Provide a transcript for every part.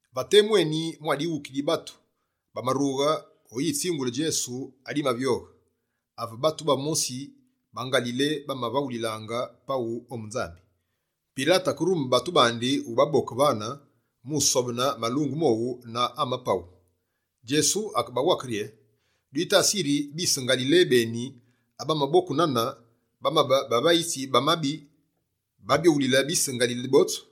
Va temu eni mwa dighuki di batu, bamarughe oyi tsingule Djesu adimavyoghe: ave batu bamosi ba Ngalile, bamavaghulilaange paghu ombu Nzambi, Pilate akerume batu bandi ubaboke vane, mu usobene malungu mowu na ama paghu. Djesu akebawake rye: «Dwitasi yiri, bise Ngalile beni abamaboku nane, bamabe bavayitsi ba mabi bavyoghulile bise Ngalile botsu?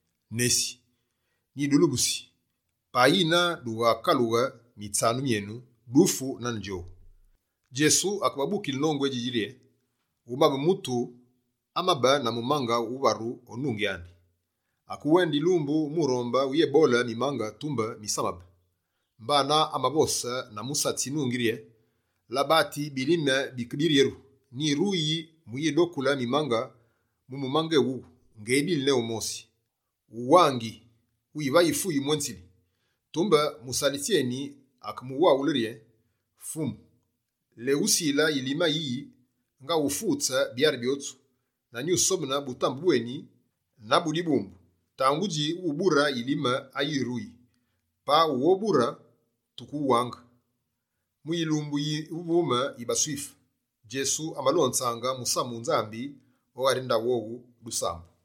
Nesi, nyidulubusi: payi dughakaluse mitsanu myenu, dufu nane djowu.» Djesu akebabukile nongu édjidji rye: «Umabe mutu amabe na mumange wuvaru o nungi andi. Akewende yilumbu mu uronde uyéboole mimange, tumbe misamabe. Mbana, amavose na musatsi nungi rye: “Labati, bilime bike biryeru, nyiruyingi muyidokule mimange mu mumange éwuwu ngedili ne wumosi. Uwangi, wivayi fuyi mwenzili.” Tumbe musalitsi akemuwaghule: “Fumu, lewusile yilime ayiyi, ngaghufutse byari byotsu na nyusobene butambe bweni na bu dibumbu. Tangudji, wubure yilime ayiruyi. Payi wughabure, tukewuwaange.”» Mu yilumbu yuvume yi baSwife, Djesu amalonzaange musamu wu Nzambi o ghari ndaghu wowu dusambu.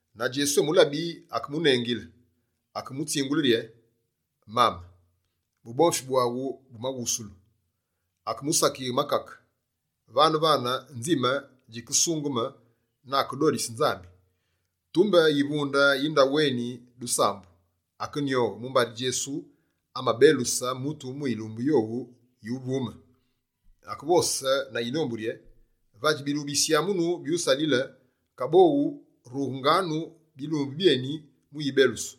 Na Djesu emulabi, akemunengile, akemutsingule rye: «Mame, bubomfi bwaghu bumaghusulu.» Akemusakighe makake. Vane-vane, nzime djikesungeme na akedodise Nzambi. Tumbe yivunde yi ndaghu eni dusambu akenyoghe, mumbari Djesu amabeluse mutu mu yilumbu yowu yuvume. Akevose na yinombu rye: «Vadji bilumbu bisyamunu byusalile, kaboghu rughenganu bilumbu byébine mu yibelusu.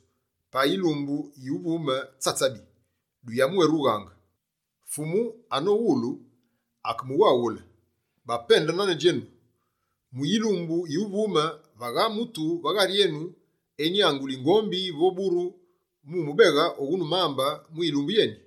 Payi yilumbu yuvume tsatsabi, duyabwérughaange.» Fumu anomuwulu, akemuwaghule: «Bapende nane djenu! Mu yilumbu yuvume, vagha mutu va ghari enu enyanguli ngombi vo buru andi mu umubeghe oghunu mambe mu yilumbu yeni?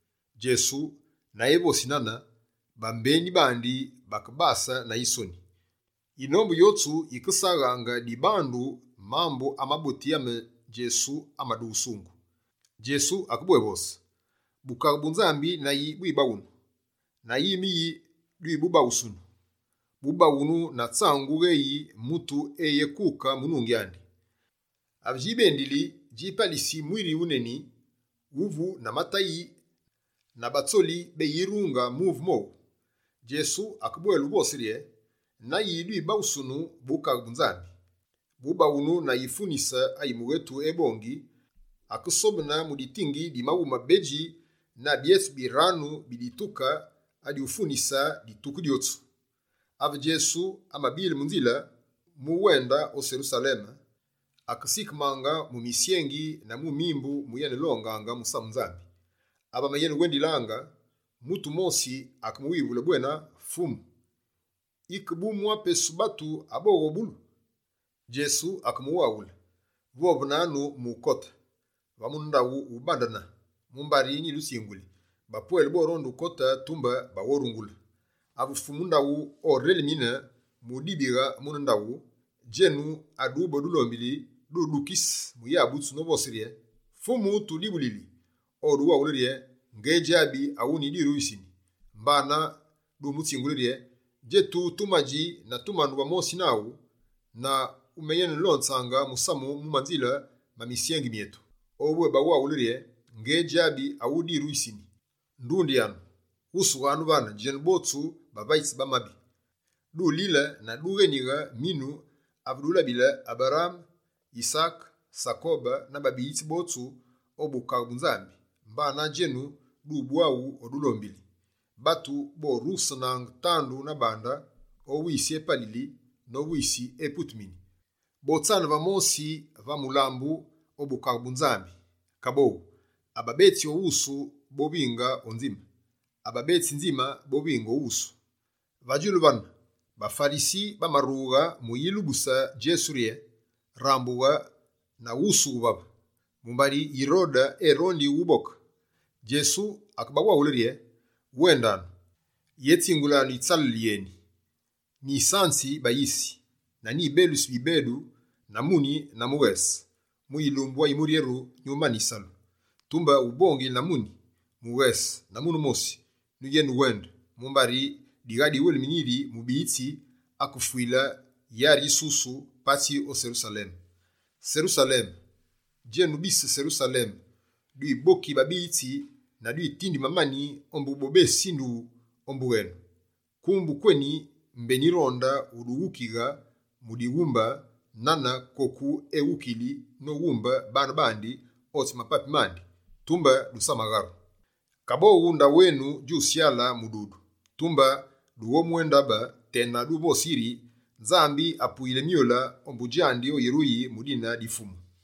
Djesu na evosi nane, bambeni bandi bakebase na yisoni. Yinombu yotsu yikesaghaange dibandu mambu amaboti maneni ame Djesu amadughusungu. Djesu akebwévose: «Bukaghe bu Nzambi na yi bubaghunu? Na yime yi nyububaghusunu? Bubaghunu na tsangu gheyi mutu eyekuke mu nungi andi. Ave djibendili, djipalisi mwiri wuneni wuvu na matayi na batsoli beyirunge muve mowu.» Djesu akebwele uvose rye: «Na yi nyubaghusunu Bukaghe bu Nzambi? Bubaghunu na yifunise ayi mughetu ebongi, akesobene mu ditingi di maghumi mabedji na byetsu biranu bi fufu mu ufunise pate-mape djotsu.» Ave Djesu amabile mu nzile mu wende o Serusaleme, akenesikemange mu misyengi na mu mimbu mu yenelongaange musamu Nzambi. Ave amenewendilaange, mutu wumosi akemuwivule bwena «Fumu, yike bu mwa pesu batu aboghobulu?» Djesu akebawaghule: «Vovenanu mu ukote, va mune ndaghu awubandene. Mumbari nyidutsinguli, bapwele boronde ukote, tumbe baghorungule. Ave Fumu ndaghu orelimine, mudibighe mune ndaghu, djenu adube o dulombili, dudukise mu yabutsu novose rye: “Fumu tudibulili.” Oduwaghule rye: “Ngedjabi awudwiruyisini!” Mbana dumutsingule rye: “Djetu tumadji na tumanu va mosi naghu, na wumenelonzaange musamu mu manzile ma misyengi myetu.” Obwébawaghule rye: “Ngédjabi odwiruyisini. Ndundyanu, ghusughanu vane djenu botsu bavayitsi ba mabi!” Dulile na dughénighe minu ave dulabile Aberaame, Yisaake, Sakobe na babiyitsi botsu o Bukaghe bu Nzambi, mbana djenu dubwaghu o dulombili! Batu borusenaange tandu na bande, o wisi epalili, no wisi eputumini. Botsane va mosi va mulambu o Bukaghe bu Nzambi. Kaboghu, Ababetsi o wusu, bovinge o nzime. Ababetsi nzime, bovinge o wusu.» Va djulu vane, baFarisi bamarughe mu uyilubuse Djesu rye: «Rambughe na wusughe vave, mumbari Yirode erondi ughuboke.» Djesu akebawaghule rye: «Wendanu, yetsingulanu yitsalele yéyine: “Nyisanzi bayisi, na nyibelusi bibedu na muni na mughese, mu yilumbu ayimuryeru nyumane yisalu.” Tumbe, ubongile na muni, mughese na mune-mosi nyuyenewende, mumbari digha diwelimine yiri mubiyitsi akefwile yari yisusu patsi o Serusaleme. Serusaleme, djenu bise Serusaleme, dwiboki babiyitsi na dwitindi mamani ombu bobésindughu ombu wenu. Kumbu kweni mbé nyironde udughukighe mu dughumbe nane koku eghukiyili noghumbe baane bandi otsi mapapi mandi, tumbe dusamagharu. Kaboghu, ndaghu enu djusyale mududu. Tumbe dughobwéndabe tena duvose yiri “Nzambi apuyili myule ombu djandi oyiruyili mu dine di Fumu!”»